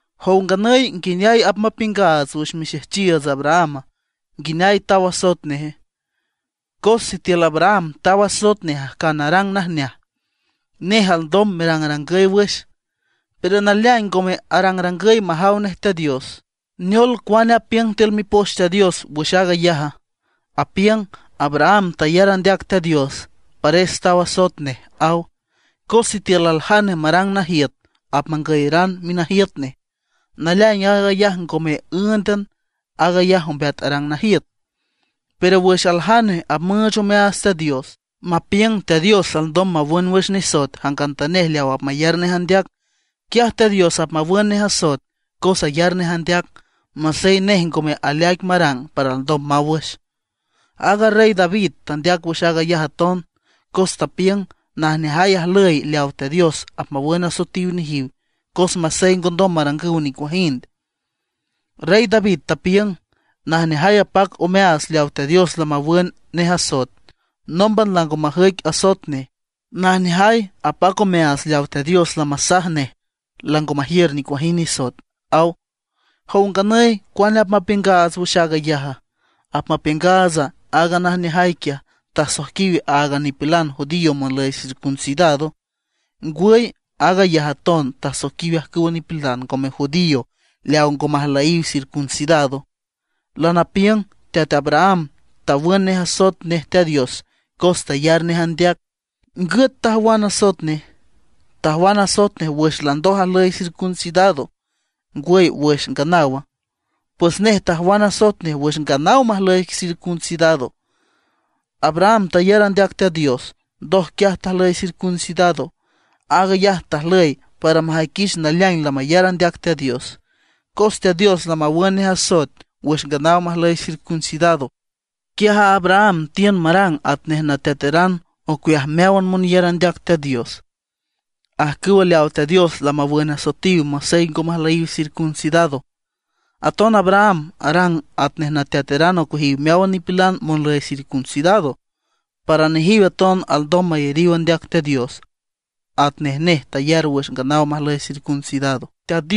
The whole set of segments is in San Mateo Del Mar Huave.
¿Jow nganüy nguineay apmapiüngaats wüx mixejchiiüts Abrahama, nguineay taw asoet neje? Cos sitiül Abraham taw asoet nej ajcan arang najneaj, nej alndom merangrangüy wüx, pero naleaing ngome arangrangüy majaw nej Teat Dios. ¿Neol cuane apiüng tiül Mipoch Teat Dios wüx aag ayaja? Apiüng: “Abraham tayar andeac Teat Dios, pares taw asoet nej”, aw. Cos sitiül aljane marang najiüt apmangüyeran minajiüt nej, naleaing aag ayaj ngome ǘündan, aag ayaj ombeat arang najiüt. Pero wüx aljane apmüüch omeaats Teat Dios, mapiüng Teat Dios alndom mawün wüx nisoet jangantanej leaw apmayar nej andeac; quiaj Teat Dios apmawün nej asoet cos ayar nej andeac, masey nej ngome aleaic marang para alndom maw wüx. Aaga Rey David tandeac wüx aag ayaj aton, cos tapiüng najneajay ajlüy leaw Teat Dios apmawün asoetiw nejiw masey ngondom marangüw nicuajind. Rey David tapiüng: Najneajay apac omeaats leaw Teat Dios lamawün nej asoet, nómban lango majüic asoet nej. Najneajay apac omeaats leaw Teat Dios lamasaj nej lango majiür nicuajind nisoet, aw. ¿Jow nganüy cuane apmapiüngaats wüx aag ayaja? ¿Apmapiüngaatsa aaga najneajay quiaj, tasoiquiw áagan nipilan judío monlüy circuncidado? ¿Ngwüy aag ayaj aton tasoiquiw ajcüwa nipilan ngome judío leaw ngo majlüyiw circuncidado? Lanapiüng Teat Abraham tawün nej asoet nej Teat Dios cos tayar nej andeac. ¿Ngüt tajwan asoet nej? ¿Tajwan asoet nej wüx landoj ajlüy circuncidado, ngwüy wüx nganawa? Pues nej tajwan asoet nej wüx nganaw majlüy circuncidado. Abraham tayar andeac Teat Dios, ndoj quiaj tajlüy circuncidado. Aag ayaj tajlüy para majüiquich naleaing lamayar andeac Teat Dios. Cos Teat Dios lamawün nej asoet wüx nganaw majlüy circuncidado, quiaj a Abraham tiün marang atnej nateataran ocueajiw meáwan monyar andeac Teat Dios, ajcüw leawa Teat Dios lamawün asoetiw masey ngo majlüyiw circuncidado. Aton Abraham arang atnej nateataran ocueajiw meáwan nipilan monlüy circuncidado, para nejiw aton alndom mayariw andeac Teat Dios atnej nej tayar wüx nganaw majlüy circuncidado.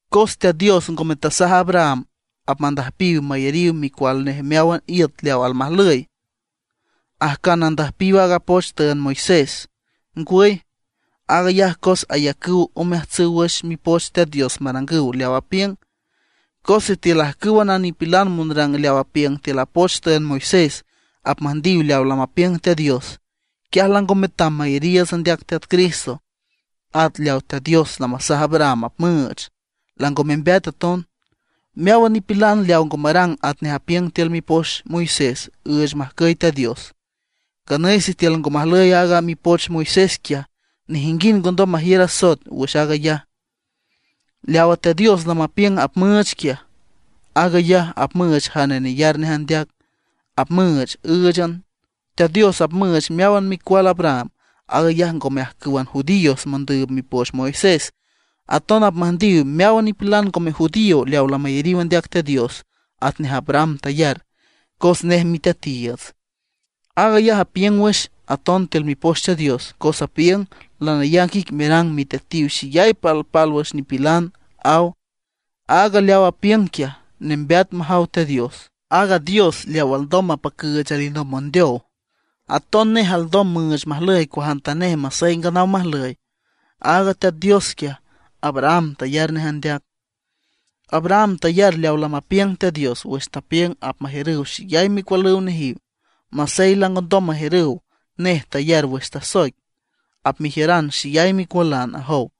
Cos Teat Dios ngome tasaj a Abraham apmüjndiw mayariw micual nej meáwan iüt leaw almajlüy, ajcan andüjpiw aaga poch tüünd Moisés. ¡Ngwüy! Aag ayaj cos ayacüw omeajtsüw wüx Mipoch Teat Dios marangüw leaw apiüng. Cos sitiül ajcǘwan a nipilan monrang leaw apiüng tiül a poch tüünd Moisés apmüjndiw leaw lamapiüng Teat Dios, quiaj lango metam mayariiüts andeac Teat Cristo. At leaw Teat Dios lamasaj Abraham apmüüch, lango membeat aton. Meáwan nipilan leaw ngo marang atnej apiüng tiül mipoch Moisés üüch majcüy Teat Dios. Nganüy sitiül ngo majlüy aaga mipoch Moisés quiaj, nejinguind ngondom majiür asoet wüx aag ayaj. Leawa Teat Dios lamapiüng apmüüch quiaj, aag ayaj apmüüch jane neyar nej andeac, apmüüch ǘüchan. Teat Dios apmüüch meáwan micual Abraham. Aag ayaj ngome ajcǘwan judíos mondüüb mipoch Moisés, aton apmüjndiw meáwan nipilan ngome judío leaw lamayariw andeac Teat Dios atnej Abraham tayar, cos nej miteatiiüts. Aag ayaj apiüng wüx aton tiül Mipoch Teat Dios, cos apiüng: “Lanayac ic merang miteatiw xeyay palpálwüx nipilan”, aw. Aaga leaw apiüng quiaj, nembeat majaw Teat Dios, aaga Dios leaw alndom mapacüüch alinomb mondeow. Aton nej alndom müüch majlüy cuajantanej masey nganaw majlüy. Aaga Teat Dios quiaj, Abraham tayar nej andeac. Abraham tayar leaw lamapiüng Teat Dios wüx tapiüng apmajiürüw xeyay micualüw nejiw, masey langondom majiürüw. Nej tayar wüx tasoic: “Apmejiüran xeyay micualan”, ajow.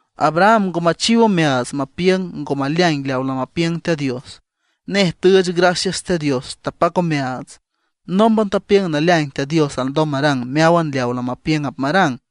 Abraham ngo machiw omeaats mapiüng ngo maleaing leaw lamapiüng Teat Dios. Nej tüüch gracias Teat Dios, tapac omeaats. Nómban tapiüng naleaing Teat Dios alndom marang meáwan leaw lamapiüng apmarang.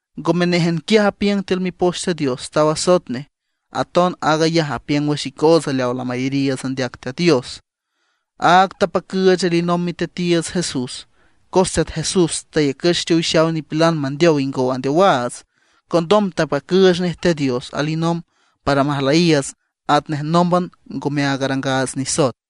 Ngome néjan quiaj apiüng tiül Mipoch Teat Dios taw asoet nej, Aton aag ayaj apiüng wüx icootsa leaw lamayariiüts andeac Teat Dios, áag tapacüüch alinomb Miteatiiüts Jesús. Cos Teat Jesús tayacüch teowixaw nipilan mandeow ingow andeowaats, condom tapacüüch nej Teat Dios alinomb para majlüyiiüts atnej nómban ngome aag arangaats nisoet.